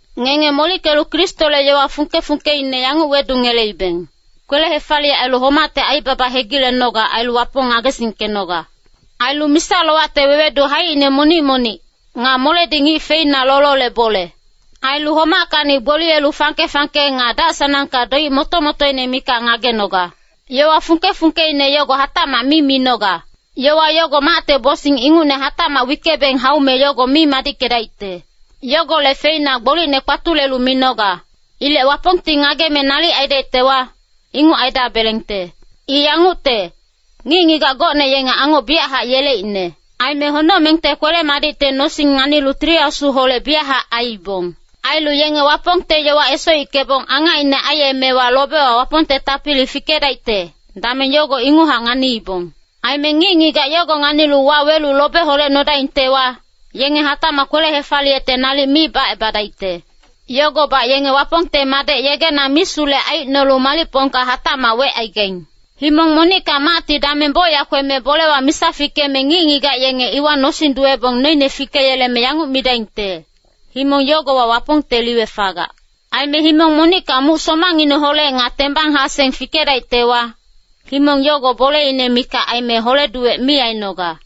Ngenge molickelu Kristole yowa fungke-fungkeine yanguc wedungeleibeng, kwele-hefaliyec ailu homacte aibaba hegilenoga ailu Wapong ngagesingkenoga. Ailu misa-lowacte wewedu haicine monic-monic, nga moledi ngic feina lolole bole. Ailu homackacni gboliyelu fangke-fangke nga dac-sanangka doic moto-motoine mikac ngagenoga. Yowa fungke-fungkeine yogo hatacmac mi minoga. Yowa yogo macte bosing ingucne hatacmac wickebeng haume yogo mi madickedaicte. Yogolec feina gbolicne kpatulelu minoga. Ilec Wapongti ngageme nalic aidaictewa, inguc aidabelengte. I yangucte, ngic-ngigac gocne yenge angoc biyachac yeleicne. Aime honocmengte kwele-madicte nosing nganilu Tili Asuholec biyachac aiibong. Ailu yenge Wapongte yowa esoickebong angacine aiyemewa lobewa Wapongte tapili fikedaicte, dameng yogo inguchac nganiibong. Aime ngic-ngigac yogo nganilu wawelu lobe holedaingtewa, yenge hatacmac kwele-hefaliyecte nalic mi bacebadaicte. Yogobac yenge Wapongte Madec yegena misulec aicnolu malicpongka hatacmac wecaigaing. Himong monicka macti dameng bocyac kweme bolewa misa fikeme ngic-ngigac yenge iwa nosing duwebong noine fikeyeleme yanguc midaingte, himong yogowa Wapongte liwe fagac. Aime himong monicka muc somangineholec nga tembang-haseng fikedaictewa, himong yogo boleine mikac aime hole-duwec mi ainoga.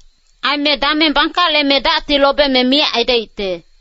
Aime dameng bangkaleme dacti lobeme miyac aidaicte.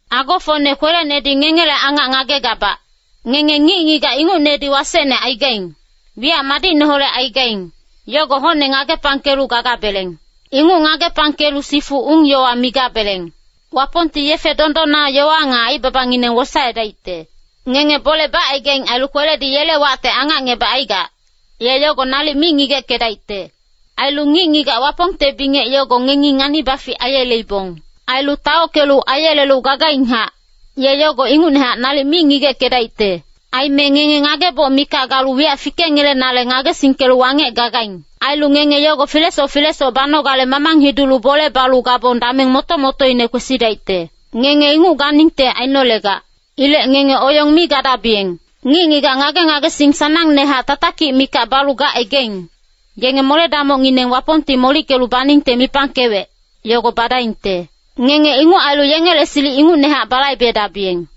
Agofocne kwelenedi ngengele angac ngagegabac, ngenge ngic-ngigac ingucnedi wasecne aigaing, wiyac madicneholec aigaing, yogo hocne ngagepangkelu gagabeleng. Inguc ngagepangkelu sifu ung-yowa migabeleng. Wapongti yefe dondonna yowa nga aibabangineng wosaedaicte. Ngenge bole bacaigaing ailu kweledi yele wacte angacngebacaigac, ye yogo nalic mi ngigeckedaicte. Ailu ngic-ngigac Wapongte bingec yogo ngengi ngani-bafic aiyeleibong. Ailu taockelu aiyelelu gagainghac, ye yogo ingucnehac nalic mi ngigeckedaicte. Aime ngenge ngageboc mikac galu wiyac fikengelenale ngagesingkelu wangec gagaing. Ailu ngenge yogo filesoc filesoc banogale mamang hidulu bole balu gabong dameng moto-motoine kwesidaicte. Ngenge inguc ganingte ainolegac. Ilec ngenge oyong mi gadabiyeng. Ngic-ngigac ngage-ngagesing sanangnehac tatakic mikac balu gacaigaing, yenge mole-damocngineng Wapongti molickelu baningte mipangkewec, yogo badaingte. Ngenge inguc ailu yengele silic ingucnehac balaibedabiyeng.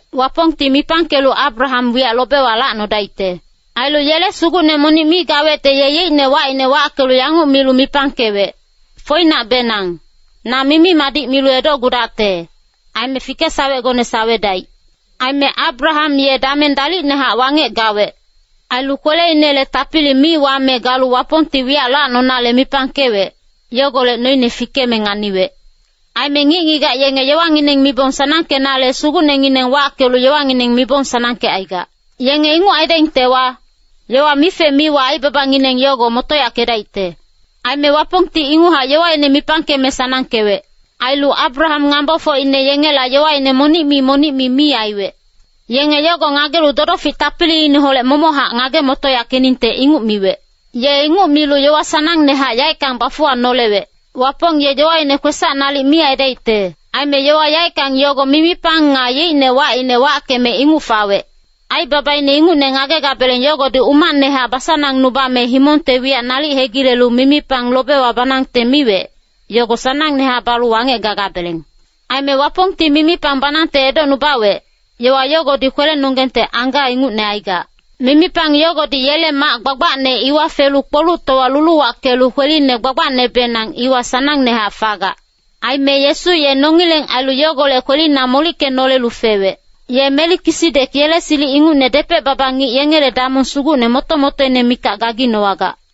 Wapongti mipangkelu Abraham wiyac lobewa lacnodaicte. Ailu yele Sugucne monic mi gawecte ye yeicne wacine wackelu yanguc milu mipangkewec, “Foinacbenang, na mimi-madic milu edocgudacte, aime fikesawecgone sawedaic.” Aime Abraham ye dameng dalicnehac wangec gawec. Ailu kweleinele tapili mi wame galu Wapongti wiyac lacnonale mipangkewec, yogolec noine fikeme nganiwec. Aime ngic-ngigac yenge yowangineng mibong sanangkenale sugucnengineng wackelu yowangineng mibong sanangkecaigac. Yenge inguc aidaingtewa, yowa mife-miwa aibabangineng yogo motoyackedaicte. Aime Wapongti inguchac yowaine mipangkeme sanangkewec. Ailu Abraham ngambofocine yengela yowaine monic-mi monic-mi mi aiwec. Yenge yogo ngagelu dodofic tapiliine momochac ngage-motoyackeningte inguc miwec. Ye inguc milu yowa sanangnehac yaeckang bafuwanolewec. Wapong ye yowaine kwesac nalic mi aidaicte. Aime yowa yaeckang yogo mimipang nga yeicne wacine wackeme inguc fawec. Aibabaine ingucne ngagebeng yogodi umacnehac basanangnubame himongte wiyac nalic hegilelu mimipang lobewa banangte miwec, yogo sanangnehac balu wangec gagabeleng. Aime Wapongti mimipang banangte edocnubawec, yowa yogodi kwelenonggengte angga ingucne aigac. Mimipang yogodi yele mac gbagbacne iwa felu kpoluctowa luluwackelu kweline gbagbacnebenang iwa sanangnehac fagac. Aime Yesu ye nongileng ailu yogolec kwelina molickenolelu fewec. Ye Melikisidek yele silic ingucne depec-baba ngic yengele damong sugucne moto-motoine mikac gaginowagac.